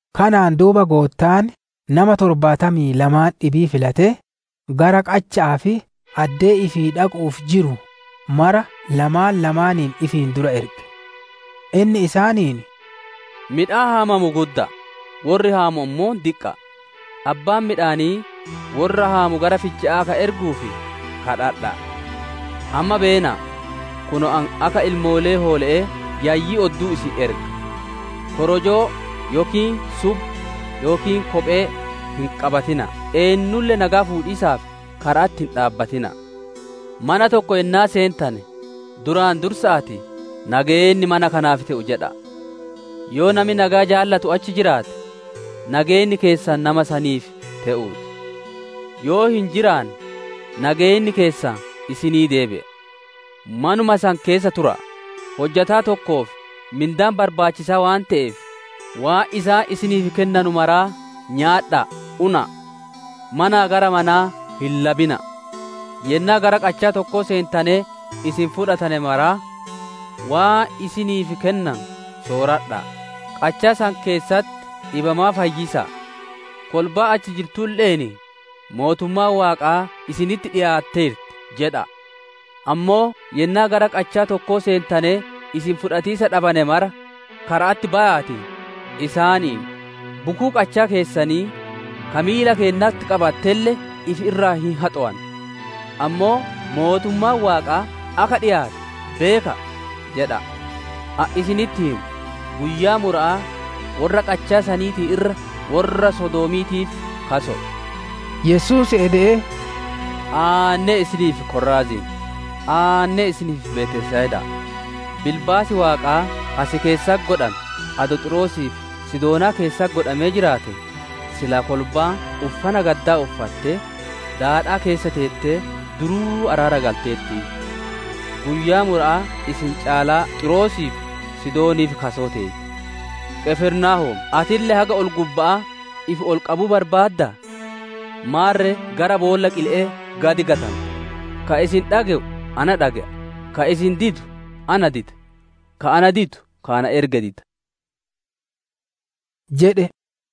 Kanaan duuba Goottaan nama torbaatamii lamaan dhibii filatee, gara qacha'aa fi addee ifii dhaqu'uuf jiruu mara lamaan lamaaniin ifiin dura erge. Inni isaaniin, «Midhaan haamamu gudda'aa, worri haamu ammoo diqqa'a; abbaan midhaanii worra haamu gara ficha'aa akka erguuf daadimadha'a. Amma beena'a! Kunoo ani akka ilmoolee hoole'ee yayyii odduu isin erga. Korojoo yookiin subba yookiin kophee hin qabatina'a; eennulle nageya fuudhiisaaf kara'atti hin dhaabbatina'a. Mana tokko yennaa seentane duraan dursa'aatii, ‹Nageenni mana kanaaf te'uu!› jedha'a. Yoo nami nageya jaalatu achi jiraate, nageenni keessan nama saniif te'uu ti; yoo hin jiraanne, nageenni keessan isinii deebi'a. Manuma san keessa tura'a; hojjataa tokkoof mindaan barbaachisaa waan te'eef, waan isaan isiniif kennanu maraa nyaadha'aa una'a. Manaa gara manaa hin labina'a! Yennaa gara qachaa tokkoo seentanee isin fudhatane maraa, waan isiniif kennanu sooradha'a; qachaa san keessatti dhibamaa fayyisa'a; kolbaa achi jirtulle'een, ‹Mootummaan Waaqaa isinitti dhikaateerti› jedha'a. Ammoo yennaa gara qachaa tokkoo seentanee isin fudhatiisa dhabane mara, kara'atti baya'aatii, isaaniin ‹Bukuu qachaa keessanii ka miila keennatti qabattelle ifi irraa hin haxowanna; ammoo mootummaan Waaqaa akka dhikaatte beeka'a!› jedha'a. Ani isinitti hima, guyyaa mura'aa worra qachaa saniitiin irra worra Sodoomiitiif kaso'o» jedhe. Yesuus ede'ee, «Aannee si'iif, Koraaziin! Aannee si'iif, Betsayida'a! Bilbaasi Waaqaa ka si keessatti godhame, adoo Xiiroosii fi Sidoonaa keessatti godhamee jiraatee, silaa kolbaan uffana gaddaa uffattee, daadhaa keessa teetee duruu araara galteertiiyyu. Guyyaa mura'aa isin caalaa Xiiroosii fi Sidooniif kasoo teeti. Qifirnaahoom ati haga ol-gubba'aa ifi ol qabuu barbaaddaa? Maarre gara boolla qile'ee gad gatanta. «Ka isin dhage'u na dhage'a; ka isin didu na dida; ka ana didu ka ana erge dida» jedhe.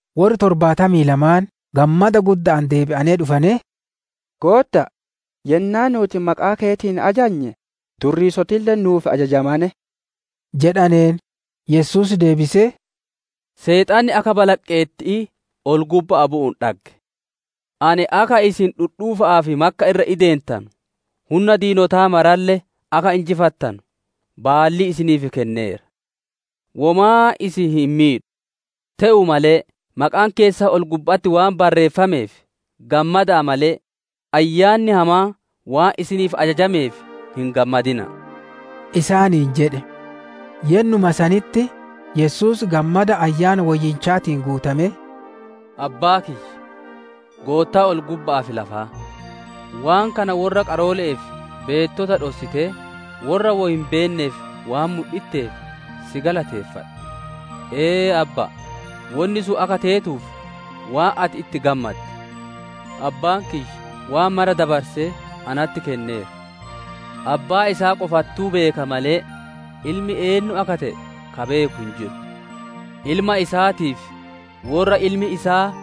Worri torbaatamii lamaan gammada gudda'aan deebi'anee dhufanee, «Goottaa, yennaa nuuti maqaa keetiin ajajne durriisotille nu'uuf ajajamane» jedhaneen. Yesuus deebisee, «Seexanni akka balaqqeetti'ii ol-gubba'aa bu'uun dhagge. Ani akka isin dhudhuufa'aa fi makka irra ideentanu, hunna diinotaa maralle akka injifattanu baallii isiniif kenneera; womaa isin hin miidhu. Te'uu malee, maqaan keessan ol-gubba'atti waan barreeffameef gammada'a malee, ayyaanni hamaan waan isiniif ajajameef hin gammadina'a» isaaniin jedhe. Yennuma sanitti, Yesuus gammada Ayyaana Woyyichaatiin guutamee, «Abbaa kiyya, Goottaa ol-gubba'aatii fi lafaa! Waan kana worra qaroole'ee fi beettota dhossitee worra wo hin beenneef waan mudhitteef si galateeffadha. Ee, Abbaa, wonni sun akka teetuuf waan ati itti gammadde. «Abbaan kiyya waan mara dabarsee natti kenneera. Abbaa isaa qofattuu beeka malee, ilmi eennu akka te'e ka beeku hin jiru; Ilma isaatii fi worra Ilmi isaa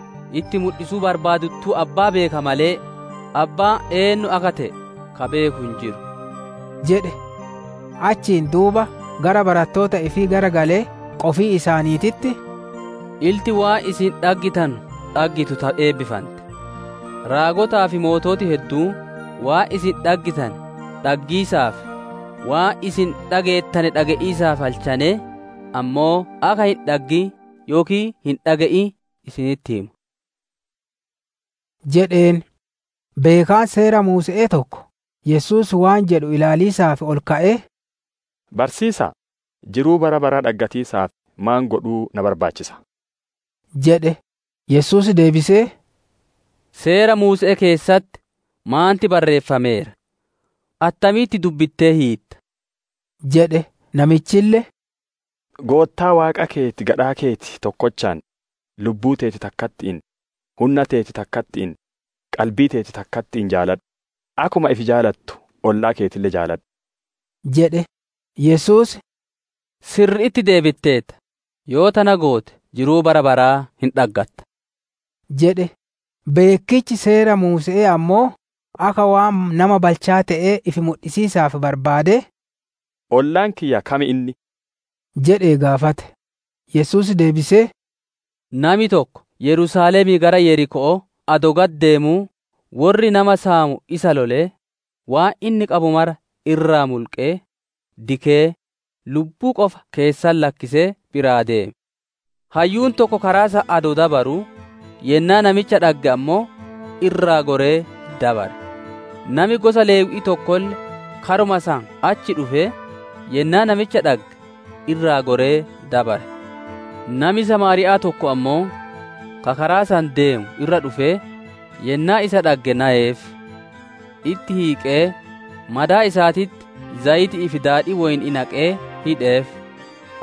itti mudhisuu barbaadettuu abbaa beeka malee, abbaan eennu akka te'e ka beeku hin jiru» jedhe. Achiin duuba gara barattoota ifii garagalee qofii isaaniititti, «Ilti waan isin dhaggitanu dhaggitu ta eebbifante. Raagotaa fi moototi hedduun waan isin dhaggitane dhaggiisaaf, waan isin dhageettane dhage'iisaaf halchanee, ammoo akka hin dhaggin yookiin hin dhage'in isinitti hima» jedheen. Beekaan seera Muuse'ee tokko Yesuus waan jedhu ilaaliisaaf ol ka'ee, «Barsiisa'a, jiruu bara baraa dhaggatiisaaf maan godhuu na barbaachisa?» jedhe. Yesuus deebisee, «Seera Muuse'ee keessatti maanti barreeffameera? Attamitti dubbittee hiitta?» jedhe. Namichille, «Goottaa Waaqa keeti gadhaa keeti tokkochaan, lubbuu teeti takkatti'iin, hunna teeti takkatti'iin, qalbii teeti takkatti'iin jaaladhu; akkuma ifi jaalattu ollaa keetille jaaladhu» jedhe. Yesuus, «Sirri'itti deebiteerta; yoo tana goote jiruu bara baraa hin dhaggatta» jedhe. Beekkichi Seera Muuse'ee ammoo akka waan nama balchaa te'ee ifi mudhisiisa barbaadee, «Ollaan kiyya kam inni?» jedhee gaafate. Yesuus deebisee, «Nami tokko Yerusaalemii gara Yeriko'oo adoo gad deemuu worri nama saamu isa lolee, waan inni qabu mara irraa mulqee, dikee, lubbuu qofa keessatti lakkisee biraa deeme. Hayyuun tokko karaa san adoo dabaruu, yennaa namicha dhagge ammoo, irraa goree dabare. Nami gosa Lewwi'ii tokkolle karuma san achi dhufee, yennaa namicha dhagge, irraa goree dabare. Nami Samaariya'aa tokko ammoo, ka karaa san deemu irra dhufee, yennaa isa dhagge nayeef. Itti hiiqee, madaa isaatitti zayiti'ii fi daadhii woyni'ii naqee hidheef;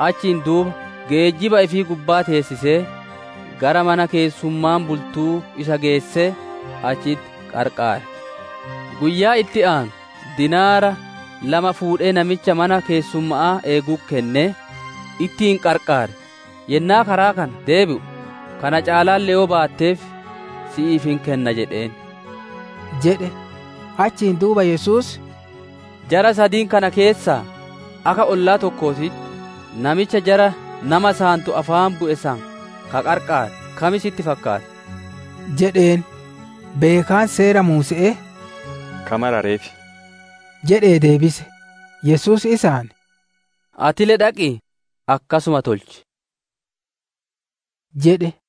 achiin duuba geejjiba ifii gubbaa teessisee, gara mana keessummaan bultuu isa geessee, achitti qarqaare. Guyyaa itti aanu dinaara lama fuudhee namicha mana keessumma'aa eegutti kennee, ‹Ittiin qarqaar; yennaa karaa kana deebi'u, kana caalaalle yoo baatteef, si'iif hin kenna› jedheen» jedhe. Achiin duuba Yesuus, «Jara sadiin kana keessaa, akka ollaa tokkootitti namicha jara nama saantu afaan bu'e san ka qarqaare kam sitti fakkaata?» jedheen. Beekaan Seera Muuse'ee, «Ka marareef» jedhee deebise. Yesuus isaan, «Atille dhaqii, akkasuma tolchi» jedhe.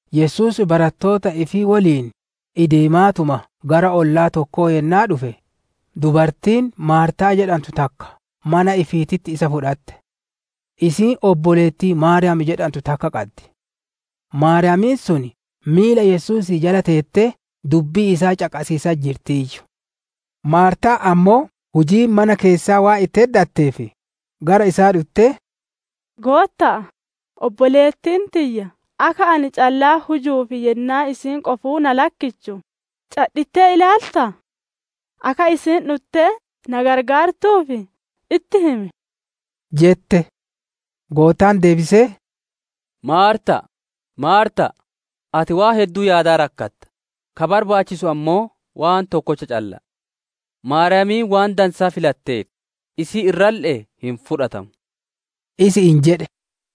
Yesuus barattoota ifii woliin ideemaatuma gara ollaa tokkoo yennaa dhufe, dubartiin Maartaa jedhantu takka mana ifiititti isa fudhate. Isiin obboleettii Maariyaam jedhantu takka qaddi; Maariyaamiin sun miila Yesuusii jala teettee dubbii isaa caqasiisatti jirtiiyyu. Maartaan ammoo hujiin mana keessaa waan itti heddatteef, gara isaa dhuttee, «Gootta'a, obboleettiin tiyya akka ani callaan hujuuf yennaa isiin qofuu na lakkittu cadhittee ilaalta? Akka isiin dhuttee na gargaartuuf itti himi» jette. Goottaan deebisee «Maarta'a, Maarta'a! Ati waan hedduu yaadaa rakkata, ka barbaachisu ammoo waan tokkocha calla'a. Maariyaamiin waan dansaa filatteerti, isii irralle'ee hin fudhatamu» isi'iin jedhe.